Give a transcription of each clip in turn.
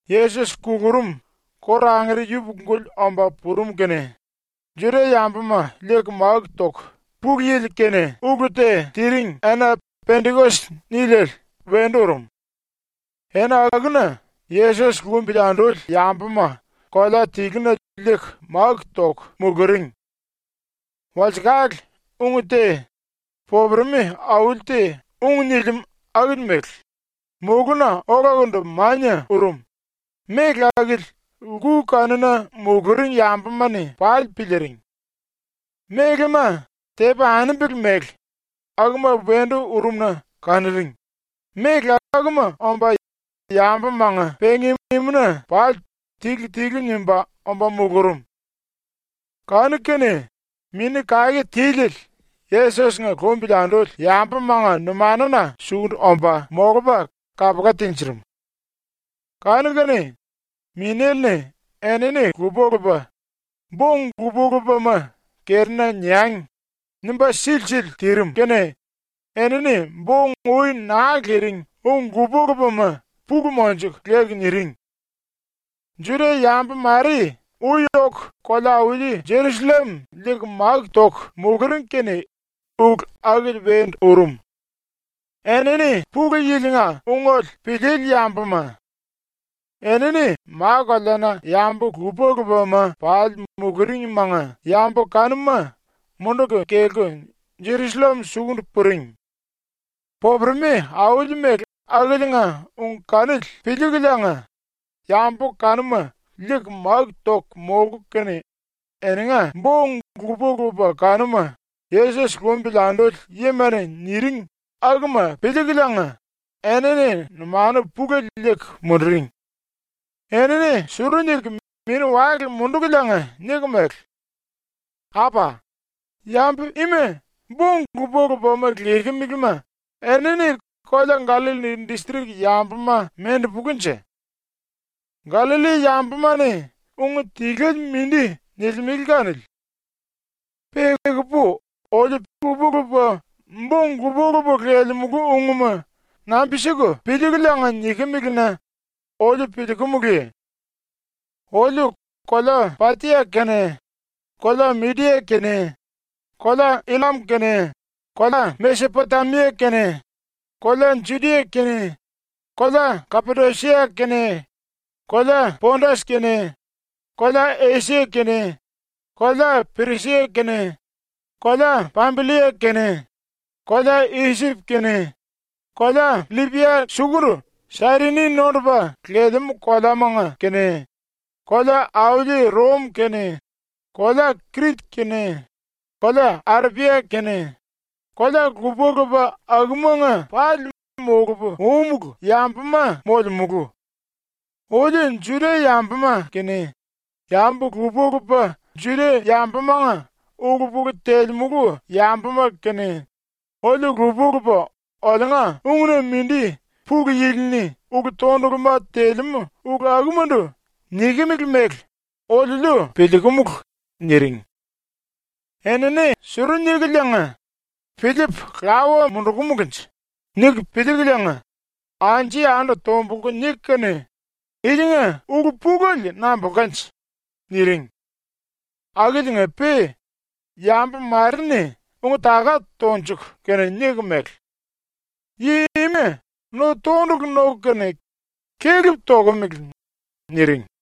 ⸤Yesos kulurum kóru angere yupuku-guli omba purum kene⸥ Juda-yambuma liiku máku toku Pulu Yili-kene ulu te tiring ena “Pendikos” niliele wendu urum. Ena akuna Yesos lumbili anduli yambuma kolea tiluna liiku máku toku muluring. Walsekale ung te, popuremi auli te ung nilimú akili mele, mulúna olakundu mania urum, méle akili lku kanuna muluring yambuma-ni pali piliiring. Mélema, tepi anembele mele, akuma wendu urum-na kanuring, méle akuma omba yambumanga ⸤pengi-imuna⸥ pali tilu-tilu nimba omba mulurum. Kanu-kene Mini Kake Tiliele Yesos-nga lumbili anduli yambumanga numanuna sukundu omba molupa kapula tinjirim. Kanu-kene Minéle-ni enini lupa-lupa ‘Bo-ung lupa-lupama kerina niangi.’ nimba silisili tirim kene enini bo-ung ui naa liring ung lupa-lupama pulu monjuku leku niring. Juda-yambu mare ui oku kolea-auli Jerusallem liiku máku toku muluring kene ulu akili wendu urum. Enini Pulu Yili-nga ungele piliili yambuma. Enini ma-koleana yambu lupa-lupama pali muluringmanga yambu kanuma munduku kelku Jerusallem sukundu puring. Popuremi auli mele akiliinga ung kanili piliikuliinga yambu kanuma liiku máku toku molku kene eninga bo-ung lupa-lupa kanuma Yesos lumbili anduli yima-ni niring akuma piliikuliinga enini numanu pulele liiku munduring. Enini suru niku mini-wale mundukuliinga niku mele: “Apa, yambu ima bo-ung lupa-lupama lekemelema enini kolea Gallalli distrik yambuma mendupulunje? ⸤Gallalli yambuma-ni ung tiluele mindi nilimele kanili.⸥ Pe ekupu oliu lupa-lupa bo-ung lupa-lupa lelemulu ungma nambi-siku piliikuliinga nikimili-na oliu piliikumuluye? “Oliu kolea Patia kene, kolea Midia kene, kolea Illam kene, kolea Mesepotemia kene, kolea Judia kene, kolea Kapadosia kene, kolea Pondas kene, kolea Esia kene, kolea Pirisia kene, kolea Pambillia kene, kolea Isip kene, kolea LLipia sukundu Sairini nondupa lelemú koleamanga kene, kolea-auli Rom kene, kolea Krit kene, kolea Arepia kene, kolea lupa-lupa akumanga pali molupu úmulu yambuma molemulu. Oliu Juda-yambuma kene yambu lupa-lupa Juda-yambumanga ulu-pulu telemulu yambuma kene, oliu lupa-lupa oliunga ung-na mindi Pulu Yili-ni ulu-tonduluma telemú ulu akumandu nikimili mele oliuliu piliikumulu.” niring. Enini suru nikuliinga ‘Piliipu lawa mundukumulunje?’ niku piliikuliinga, anju-yandu tombulku niku kene “Ilinga ulu-pulele nambulkanje?” niring. Akiliinga-pe yambu mare-ni ung-taka tonjuku kene niku mele: “Yi ima no-tondulu noku kene kelep tokomele.” niring.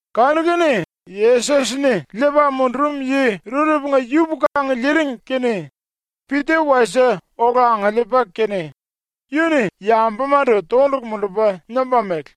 Kanu-kene, ⸤Yesos-ni liipa mundurum yi⸥ rurepunga yupuku angiliiring kene Pita wasie ola angiliipa kene yu-ni yambumandu tondulu mundupa nimba mele: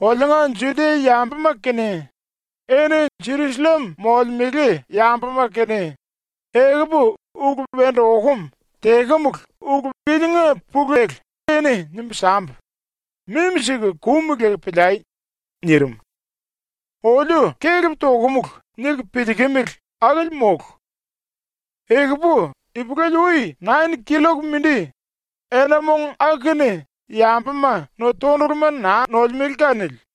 “Oliunga Judia-yambuma kene, eni Jerusallem molemele yambuma kene, ekupu ulu wendu okum tekemulu ulu ilinga pulele eni nimbu sambu, mimi siku kum leku piliai.” nirim. “‘Oliu kelep tokumulu.’ niku piliikimili akili mólu. Ekupu ipulele-ui nain killok mindi, ena-mong aku-kene yambuma no-tonduluma naa nolemele kanili.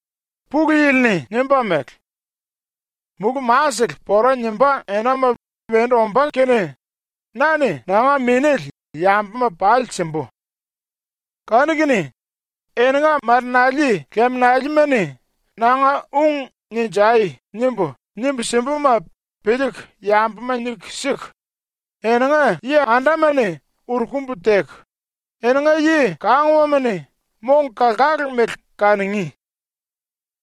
“Pulu Yili-ni nimba mele: “⸤Mulú-masele⸥ pora nimbá enama wendu ombá kene na-ni nanga Minéle yambuma pali simbu. Kanu-kene eninga marenali liminalima-ni nanga ung “Ninjai!” nimbu, nimbu simbuma piliiku yambuma niku siku, eninga yi-andama-ni uru-kumbu teku, eninga yi-kanguwama-ni mong-kalkalu mele kanungí.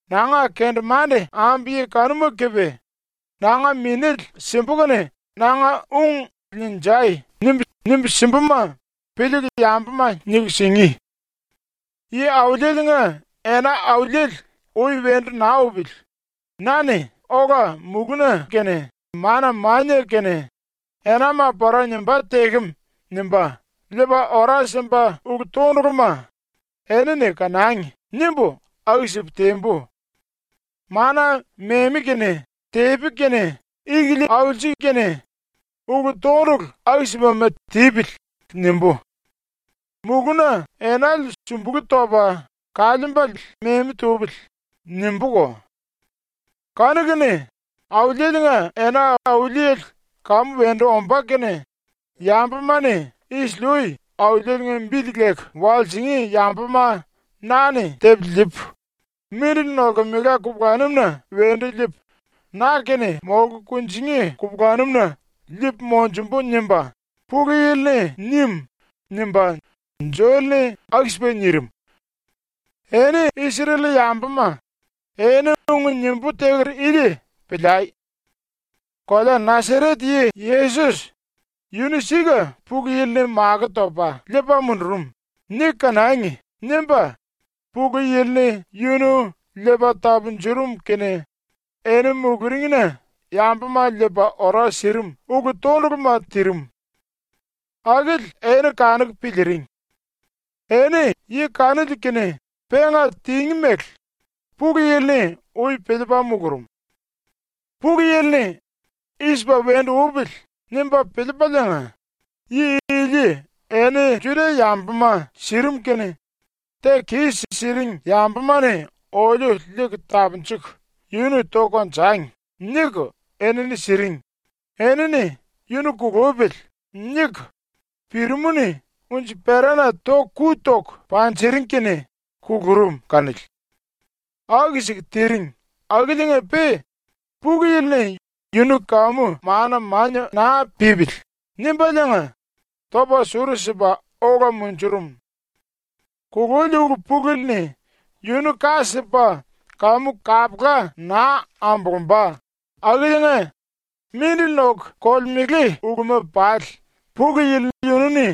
Nanga kendemande ambu yi kanuma kepe nanga Minéle simbu kene nanga ung “Ninjai!” nimbu, nimbu simbuma piliiku yambuma niku singí. Yi-Auliele-nga ena auliele ui wendu naa upili na-ni ola mulú-na kene mana-mania kene ⸤enama pora nimbá tekem nimba⸥ liipa ora simba ulu-tonduluma ‘Enini kanangi.’ nimbu aku-sipu tembu. ‘Mana memi kene tepi kene ikilia aulsi kene, ulu-tondulu aku-sipama tipili.’ nimbú. ‘Mulúna enale sumbulú topa kaliimbale memi tupili.’ nimbúko. Kanu-kene Auliele-nga ena auliele kamu wendu ombá kene yambuma-ni isili-ui Auliele-nga bili leku walsingí yambuma na-ni tepu liipu, mindili nolkemela kupulanum-na wendu liipu na-kene molku kunjingí kupulanum-na liipu monjumbu.” nimba Pulu Yili-ni nim.” nimba Joel-ni nirim. “Eni Isrel-yambuma, eni ung nimbú teker ili piliai. ‘Kolea Nasaret yi Yesos ‘Yunu sika Pulu Yili-ni makó topa liipa mundurum.’ niku kanangi.’ nimba Pulu Yili-ni yunu liipa tapunjurum kene eni muluringna yambuma liipa ora sirim ulu-tonduluma tirim. Akili eni kanuku piliiring. Eni yi kanili-kene penga tingí mele Pulu Yili-ni ui piliipa mulurum. Pulu Yili-ni ‘I-sipa wendu upili.’ nimba piliipaliinga yi ili eni Juda-yambuma sirim kene ‘Teku kis-siring yambuma-ni oliu liiku tapunjuku yunu toku konjangi.’ niku enini siring, enini ‘Yunu kulupili.’ niku pirimú-ni unji-perana ⸤toku⸥ ku toku panjiring kene kulurum kanili. ⸤Aku-siku tiring⸥ akiliinga-pe Pulu Yili-ni ‘Yunu kamu mana-mania naa pípili.’ nimbaliinga topa suru-sipa ola munjurum. Kululi ulu-pulele-ni yunu ka sipa kamu kapula naa ambulumba akiliinga mindili noku kolemele uluma pali Pulu Yili yunu-ni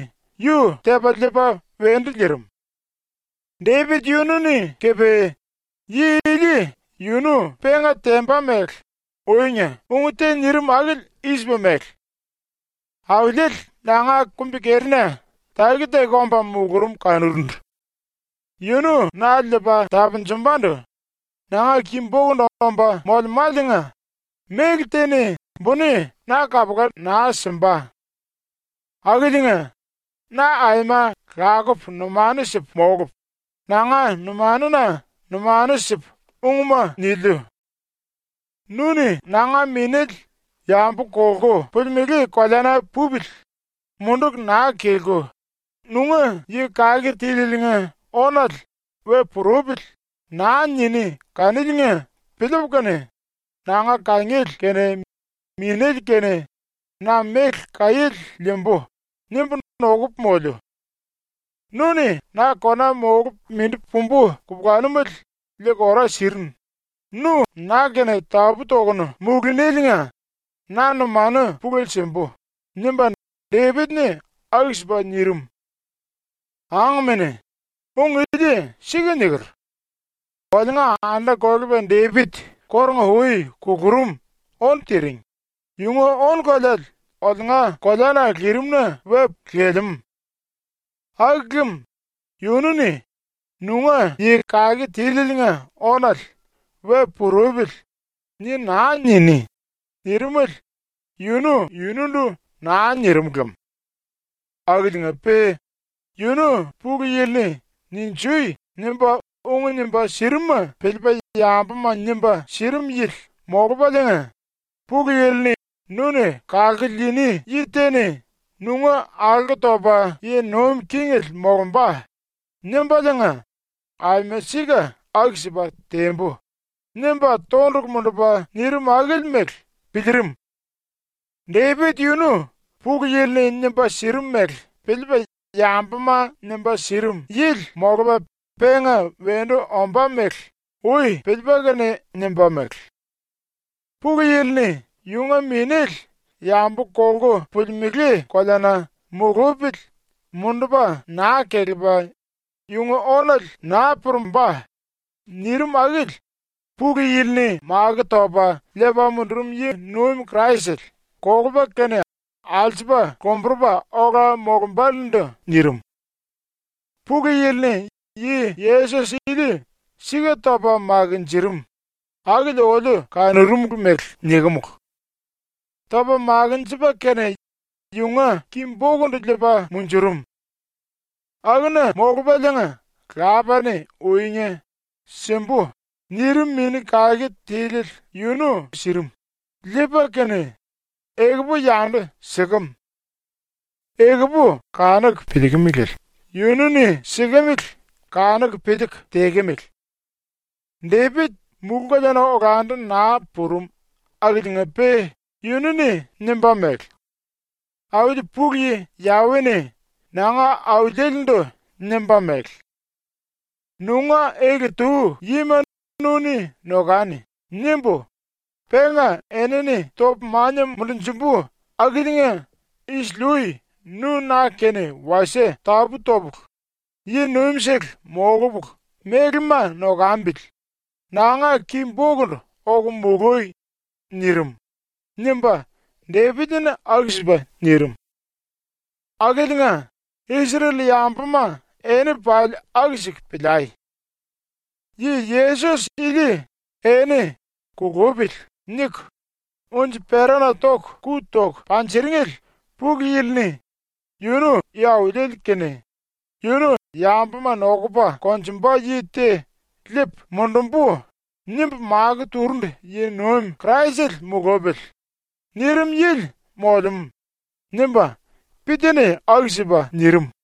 yu tepa liipa wendu liirim. “Depit yunu-ni kepe yi ili yunu penga temba mele uinga ung te nirim akili i-sipa mele: “Auliele nanga kumbi-kerina taki-taki omba mulurum kanurundu. Yunu na liipa tapunjumbandu nanga ki-bokundu omba molemáliinga méle te-ni buni na kapula naa simba. Akiliinga na aima lakupu numanu sipu molupu, nanga numanuna numanu sipu ungma niliu. Nu-ni nanga minéle yambu kolku pulimelé koleana pupili munduku naa kelku, nunga Yi Kake Tílieliinga ónale ‘We purupili.’ naa niní kaniliinga piliipu kene, ‘Nanga kangiele kene minéle kene na méle kaiéle liimbu.’ nimbu nokupu moliu. Nu-ni na kona molupu mindi pumbu kupulanumele liiku ora sirinu, nu na-kene tapú-tokunu molunéliinga na numanu pulele simbu.” nimba Depit-ni aku-sipa nirim. “Angmene, ung ili sika niker. Oliunga anda-kolepa Depit kórunga-ui kulurum ónu tiring, yunga ónu-koleale oliunga koleana lirim-na lelemú. Aku lem yunu-ni ‘Nunga Yi Kake Tílieliinga ónale ‘We purupili.’ ni naa niní.’ nirimele yunu yunundu naa nirim lem. Akiliinga-pe yunu Pulu Yili-ni “Ninjui!” nimba ung nimba sirimuma piliipa yambuma nimba sirim yili molupaliinga, Pulu Yili-ni “Nu-ni kalku liini yi te-ni nunga alko topa yi nuim kingele molumba.” nimbaliinga “Aima sika aku-sipa tembu.” nimba tondulu mundupa nirim akili mele piliirim. Depit ⸤yunu Pulu Yili-ni nimba sirim mele piliipa yambuma nimba sirim yili molupa⸥ penga wendu ombá mele ui piliipa kene nimba mele: ‘Pulu Yili-ni yunga minéle yambu kolku pulimelé koleana mulupili mundupa naa kelepa, yunga ónale naa purumbá.’ nirim akili Pulu Yili-ni makó topa liipa mundurum yi-nuim Kraisele kolupa kene alsupa lomburupa ola molumbálendu nirim. Pulu Yili-ni yi Yesos ili sika topa makinjirim, akili oliu kanurumulu mele nikimulu. “Topa makinjipa kene yunga ki-bokundu liipa munjurum. Akuna molupaliinga Lapa-ni uinga “Simbu.” nirim Mini Kake Tiliele yunu sirim, liipa kene, ekupu yandu sikem. Ekupu kanuku piliikimilele yunu-ni sikemele kanuku piliiku tekemele. Depit mulú-koleana olandu naa purum akiliinga-pe yunu-ni nimba mele: “Auli ⸤Pulu Yi Yawe-ni⸥ nanga Auliele-ndu nimba mele: “‘Nunga ele-tu yima nu-ni nokani.’ nimbu, penga enini topu mania mundunjumbu akiliinga isili-ui nu ⸤na-kene wasie tapú topulu yi-nuimsele molupulu mélema nokambili⸥ nanga ki-bokundu oku molui.” nirim.” nimba Depit-ni aku-sipa nirim. “Akiliinga Isrel-yambuma eni pali aku-siku piliai: Yi Yesos ili eni “Kulupili.” niku unji-perana ⸤toku⸥ ku toku panjiringele Pulu Yili-ni “Yunu Yi-Auliele kene, yunu ‘Yambuma nokupa konjumba yi te liipu mundumbu.’ nimbu makó turundu yi-nuim Kraisele mulupili.” nirim yili molemú.” nimba Pita-ni aku-sipa nirim.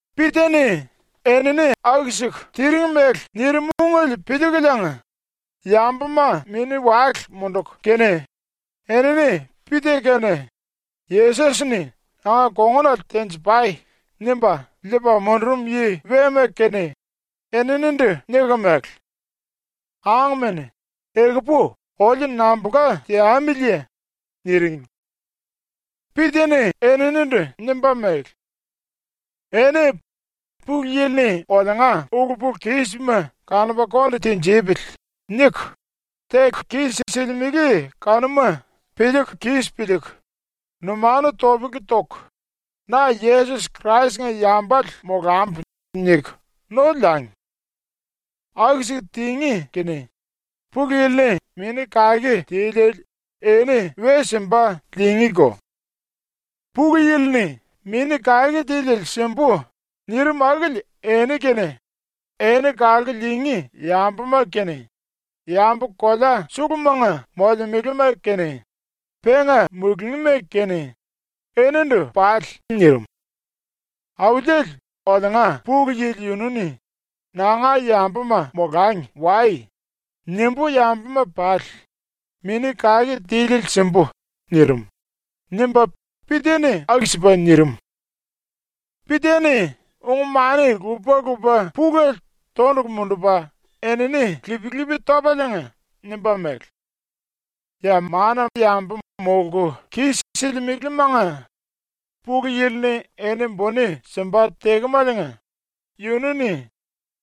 Pita-ni enini aku-siku tiring mele nirim ungele piliikuliinga yambuma mini-wale munduku kene enini Pita kene Yesos-ni “Nanga kongunale tenji-pai.” nimba liipa mundurum yi wema kene eninindu niku mele: “Angmene, ekupu oliu nambulka teamiliye?” niring. Pita-ni eninindu nimba mele: “Eni ‘Pulu Yili-ni oliunga ulu-pulu-kísima kanupa konde tinjipili.’ niku, teku kis-silimele kanuma piliiku kis piliiku, numanu topele toku, ‘Na Yesos Krais-nga yambale molambu.’ niku no liangi. Aku-siku tingí kene Pulu Yili-ni Mini Kake Tiliele eni we simba liingíko. Pulu Yili-ni ‘Mini Kake Tiliele simbu.’ nirim akili eni kene eni kalku liingí yambuma kene yambu kolea sulumanga molemelema kene penga mulungíma kene enindu pali nirim. Auliele oliunga Pulu Yili yunu-ni ‘ ‘Nanga yambuma molangi wai.’ nimbú yambuma pali Mini Kake Tiliele simbu.’ nirim.” nimba Pita-ni aku-sipa nirim. Pita-ni ung-mani lupa-lupa pulele tondulu mundupa enini lip-lipi topaliinga nimba mele: “Ya mana yambu molku kis-silimelemanga Pulu Yili-ni eni buni simba tekemaliinga yunu-ni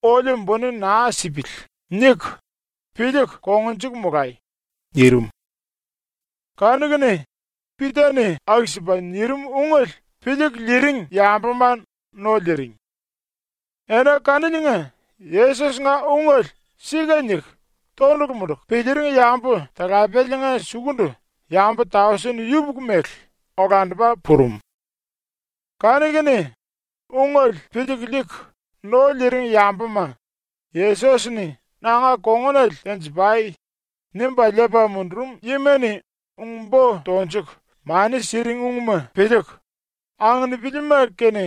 ‘Oliu buni naa sipili.’ niku, piliiku kongnjuku molai.” nirim. Kanu-kene Pita-ni aku-sipa nirim ungele piliiku liiring yambuma no liiring. Ena kaniliinga Yesos-nga ungele ‘Sika’ niku tondulu munduku piliiring yambu-talapeliinga sukundu yambu tausen yupuku mele olandupa purum. Kanu-kene ⸤ungele piliiku liiku no liiring yambuma⸥ Yesos-ni “Nanga kongunale tenji-pai.” nimba liipa mundurum yima-ni ung-bo tonjuku mani siring ungma piliiku, anginipilima kene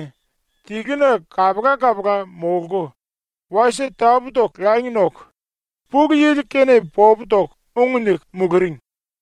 tiluna kapula-kapula molku, wasie tapú-toku langi noku, Pulu Yili-kene popu toku ung niku muluring.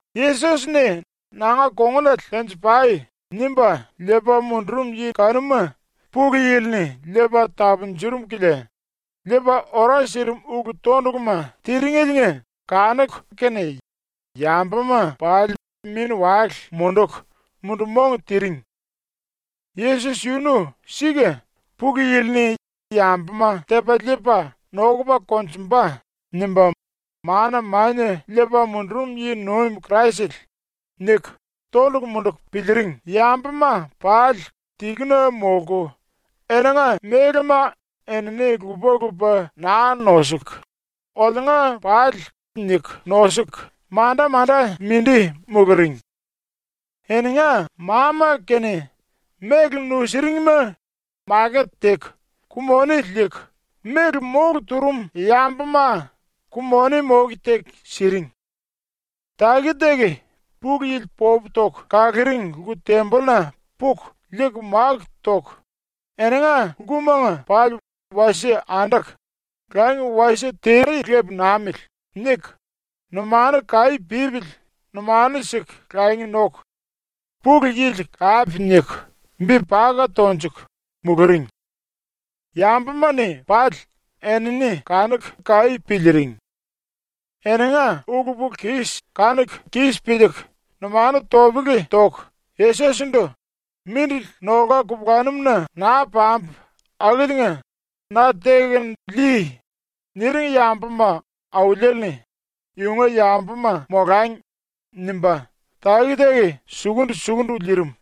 Yesos-ni “Nanga kongunale tenji-pai.” nimba liipa mundurum yi kanuma Pulu Yili-ni liipa tapunjurum kilia liipa ora sirim ulu-tonduluma tiringeliinga kanuku kene yambuma pali mini-wale munduku mundu-mong tiring. ‘Yesos yunu sika ⸤Pulu Yili-ni “Yambuma tepa liipa nokupa konjumba.” nimba mana mania liipa mundurum yi-nuim Kraisele.’⸥ niku tondulu munduku piliiring yambuma pali tiluna molku, eninga mélema enini lupa-lupa naa nosuku, ‘Oliunga pali’ niku nosuku manda-manda mindi muluring. Eninga ma-ma kene méle nusuringma maket teku ku-moni liiku méle mólu turum yambuma ku-moni moke teku siring. Taki-taki ⸤Pulu Yili popu toku kaluring⸥ lku-tembolluna puku liiku máku toku, eninga lkumanga pali wasie anduku ‘Langi wasie tere lepu namili.’ niku, numanu kaí pípili numanu siku langi noku, Pulu Yili kape niku bi paka tonjuku, muluring. Yambuma-ni pali enini kanuku kaí piliiring. Eninga ulu-pulu-kis kanuku kis piliiku numanu topele toku Yesos-ndu “Mindili nolka kupulanum-na naa pambu akiliinga na tekunu lii.” niring yambuma Auliele-ni ‘Yunga yambuma molangi.’ nimba taki-taki sukundu-sukundu liirim.